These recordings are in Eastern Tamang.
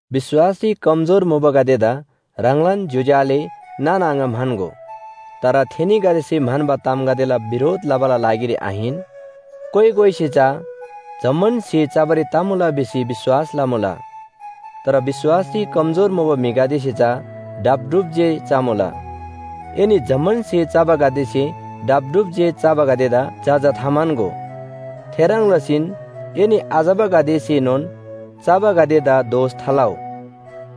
विश्‍वासरी कमजोर मुबागदेदा ह्राङलान ज्‍योज्‍यो आले नाना आङा म्‍हन्‍गो। तर थेनीगदेसे म्‍हन्‍बा तामगदेला बिरोध लबाला लागिरी आहिन। कोइ कोइसे चा जम्‍मान स्‍हे चबारी तमुला भिसी विश्‍वास लमुला, तर विश्‍वासरी कमजोर मुबा म्‍हिगदेसे चा ढापढुप जे चमुला। एनी जम्‍मान स्‍हे चबागदेसे ढापढुप जे चबागदेदा जजा थाम्‍हन्‍गो। थेह्रङ् लसीन एनी आचबागदेसेनोन चबागदेदा दोष थालउ।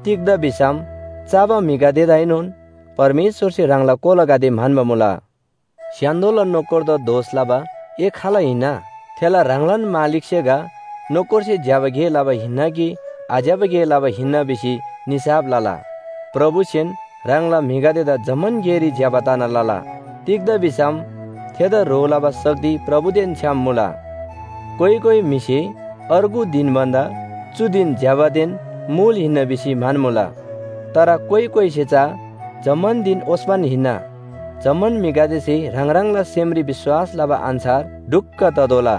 तिग्‍दा भिसम चबा म्‍हिगदेदाएनोन परमेश्‍वरसे ह्राङला कोलागदे म्‍हन्‍बा मुला। स्‍य्‍हान्‍दोला नोकरदा दोष लबा ए खाल हिन्‍ना? थेला ह्राङलान मालिकसे गा नोकरसे ज्‍यबा गे लबा हिन्‍ना कि आज्‍यबा गे लबा हिन्‍ना भिसी निसाफ लला। प्रभुसेन ह्राङला म्‍हिगदेदा जम्‍मान गेरी ज्‍यबा तना लला। तिग्‍दा भिसम थेदा ह्रो लबा शक्ति प्रभुदेन छ्‌याम मुला। कोइ कोइ म्‍हिसे अर्गु धिन भन्‍दा चु धिन ज्‍यबादेन मुल हिन्‍ना भिसी म्‍हन्‍मुला। तर कोइ कोइसे चा जम्‍मान धिन ओस्‍पन हिन्‍ना। जम्‍मान म्‍हिगदेसे ह्राङ ह्राङला सेमरी विश्‍वास लबा अन्‍छार ढुक्‍क ततोःला।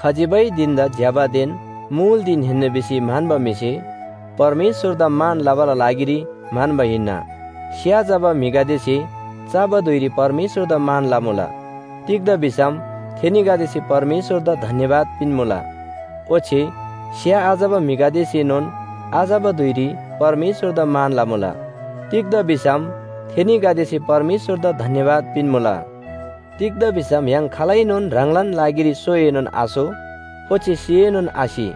खजिबै धिन‍दा ज्‍यबादेन मुल धिन हिन्‍ना भिसी म्‍हन्‍बा म्‍हिसे परमेश्‍वरदा मान लबाला लागिरी म्‍हन्‍बा हिन्‍ना। स्‍या चबा म्‍हिगदेसे चबा धुइरी परमेश्‍वरदा मान लमुला। तिग्‍दा भिसम थेनीगदेसे परमेश्‍वरदा धन्‍यवाद पिन्‍मुला। ओच्‍छे स्‍या आचबा म्‍हिगदेसेनोन आचबा धुइरी परमेश्‍वरदा मान लमुला। तिग्‍दा भिसम थेनीगदेसे परमेश्‍वरदा धन्‍यवाद पिन्‍मुला। तिग्‍दा भिसम य्‍हाङ खालैनोन ह्राङलान लागिरी सोएनोन आसो ओच्‍छे सिएनोन आसि।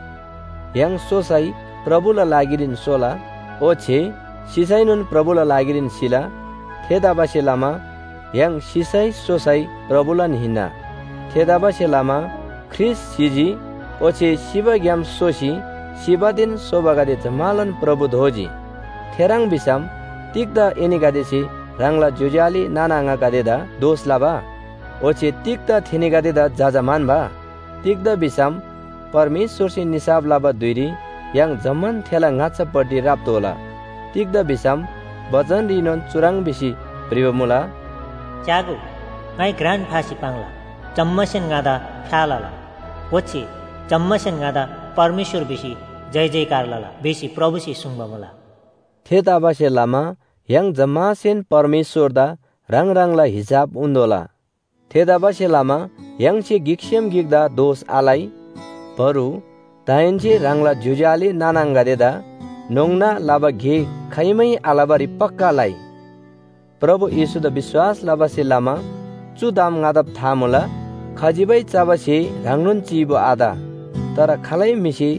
य्‍हाङ सोसै प्रभुला लागिरीन सोला ओच्‍छे सिसैनोन प्रभुला लागिरीन सिला। थेतबासेलमा य्‍हाङ सिसै सोसै प्रभुलान हिन्‍ना। थेतबासेलमा ख्रीष्‍ट सिजी ओच्‍छे सिबाग्‍याम सोसी सिबादेन सोबागदे जम्‍मालान प्रभु दोजी थेह्रङ् भिसम, तिग्‍दा एनीगदेसे ह्राङला ज्‍योज्‍यो आले नाना आङागदेदा दोष लबा? ओच्‍छे तिग्‍दा थेनीगदेदा जजा म्‍हन्‍बा? तिग्‍दा भिसम परमेश्‍वरसे निसाफ लबा धुइरी य्‍हाङ जम्‍मान थेला ङाच्‍छापट्टि राप्‍तोःला। तिग्‍दा भिसम बचनरीनोन चुह्रङ् भिसी भ्रिबा मुला, “‘च्‍यागो, ङाइ घ्रान फासी पाङ्ला, जम्‍मासेन ङादा फ्‍या लला, ओच्‍छे जम्‍मासेन ङादा परमेश्‍वर भिसी जयजयकार लला’ भिसी प्रभुसे सुङ्बा मुला।” थेतबासेलमा य्‍हाङ जम्‍मासेन परमेश्‍वरदा ह्राङ ह्राङला हिसाब उन्‍तोःला। थेतबासेलमा य्‍हाङसे गिकसेम गिकदा दोष आलइ। बरु दाहेन्‍से ह्राङला ज्‍योज्‍यो आले नाना आङागदेदा न्‍होङ्ना लबा गे खाइमै आलबारी पक्‍का लइ। प्रभु येशूदा विश्‍वास लबासे लमा चु ताम ङादा था मुला, खजिबै चबा स्‍हे ह्राङनोन चीबु आत। तर खालै म्‍हिसे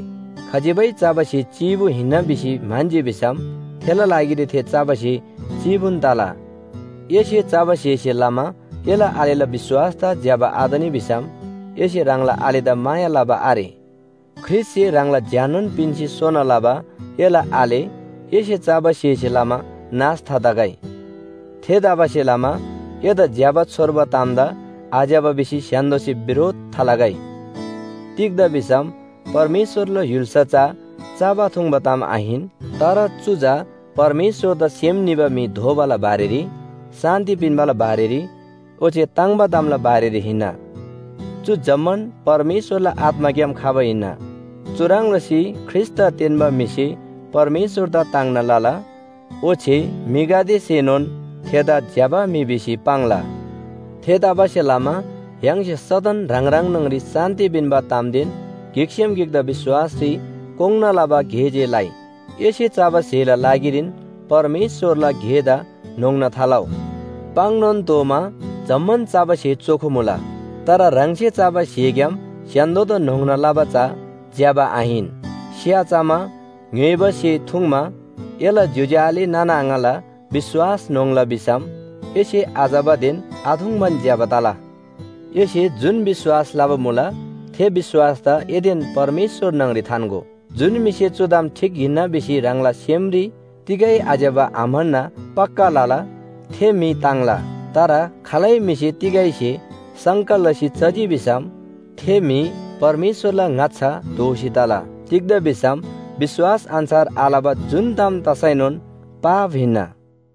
खजिबै चबा स्‍हे चीबु हिन्‍ना भिसी म्‍हन्‍जी भिसम थेला लागिरी थे चबा स्‍हे चीबुन तला। एसे चबा स्‍हेसे लमा एला आलेला विश्‍वासदा ज्‍यबा आतनी भिसम एसे ह्राङला आलेदा माया लबा आरे। ख्रीष्‍टसे ह्राङला ज्‍याननोन पिन्‍सी सोना लबा एला आले एसे चबा स्‍हेसे लमा नाश थातगै। थेतबासेलमा एदा ज्‍यबा छोर्बा तामदा आज्‍यबा भिसी स्‍य्‍हान्‍दोसे बिरोध थालगै। तिग्‍दा भिसम परमेश्‍वरला य्‍हुल्‍सा चा चबा थुङ्बा ताम आहिन। तर चु चा परमेश्‍वरदा सेम निबा म्‍हि दोबाला बारेरी, शान्‍ति पिन्‍बाला बारेरी ओच्‍छे ताङ्‍बा तामला बारेरी हिन्‍ना। चु जम्‍मान परमेश्‍वरला आत्‍माग्‍याम खबा हिन्‍ना। चुह्रङ् लसी ख्रीष्‍टदा तेन्‍बा म्‍हिसे परमेश्‍वरदा ताङ्ना लला, ओच्‍छे म्‍हिगदेसेनोन थेदा ज्‍यबा म्‍हि भिसी पाङ्ला। थेतबासेलमा य्‍हाङसे सदन ह्राङ ह्राङ न्‍हङरी शान्‍ति पिन्‍बा तामदेन गिकसेम गिकदा विश्‍वासरी कोङ्‌ना लबा गे जे लइ। एसे चबा स्‍हेला लागिरीन परमेश्‍वरला गेदा न्‍होङ्ना थालउ। पाङ्‌नोन तोःमा जम्‍मान चबा स्‍हे चोखो मुला, तर ह्राङसे चबा स्‍हेग्‍याम स्‍य्‍हान्‍दोदा न्‍होङ्ना लबा चा ज्‍यबा आहिन। स्‍या चमा, ङ्‌य्‍होइबा स्‍हे थुङ्मा एला ज्‍योज्‍यो आले नाना आङाला विश्‍वास न्‍होङ्ला भिसम एसे आचबादेन आथुङ्बान ज्‍यबा तला। एसे जुन विश्‍वास लबा मुला थे विश्‍वासदा एदेन परमेश्‍वर न्‍हङरी थान्‍गो। जुन म्‍हिसे चु ताम ठीक हिन्‍ना भिसी ह्राङला सेमरी तिगै आज्‍यबा आम्‍हन्‍ना पक्‍का लला थे म्‍हि ताङ्ला। तर खालै म्‍हिसे तिगै स्‍हे शङ्का लसी चजी भिसम थे म्‍हि परमेश्‍वरला ङाच्‍छा दोषी तला। तिग्‍दा भिसम विश्‍वास अन्‍छार आलबा जुन ताम तसैनोन पाप हिन्‍ना।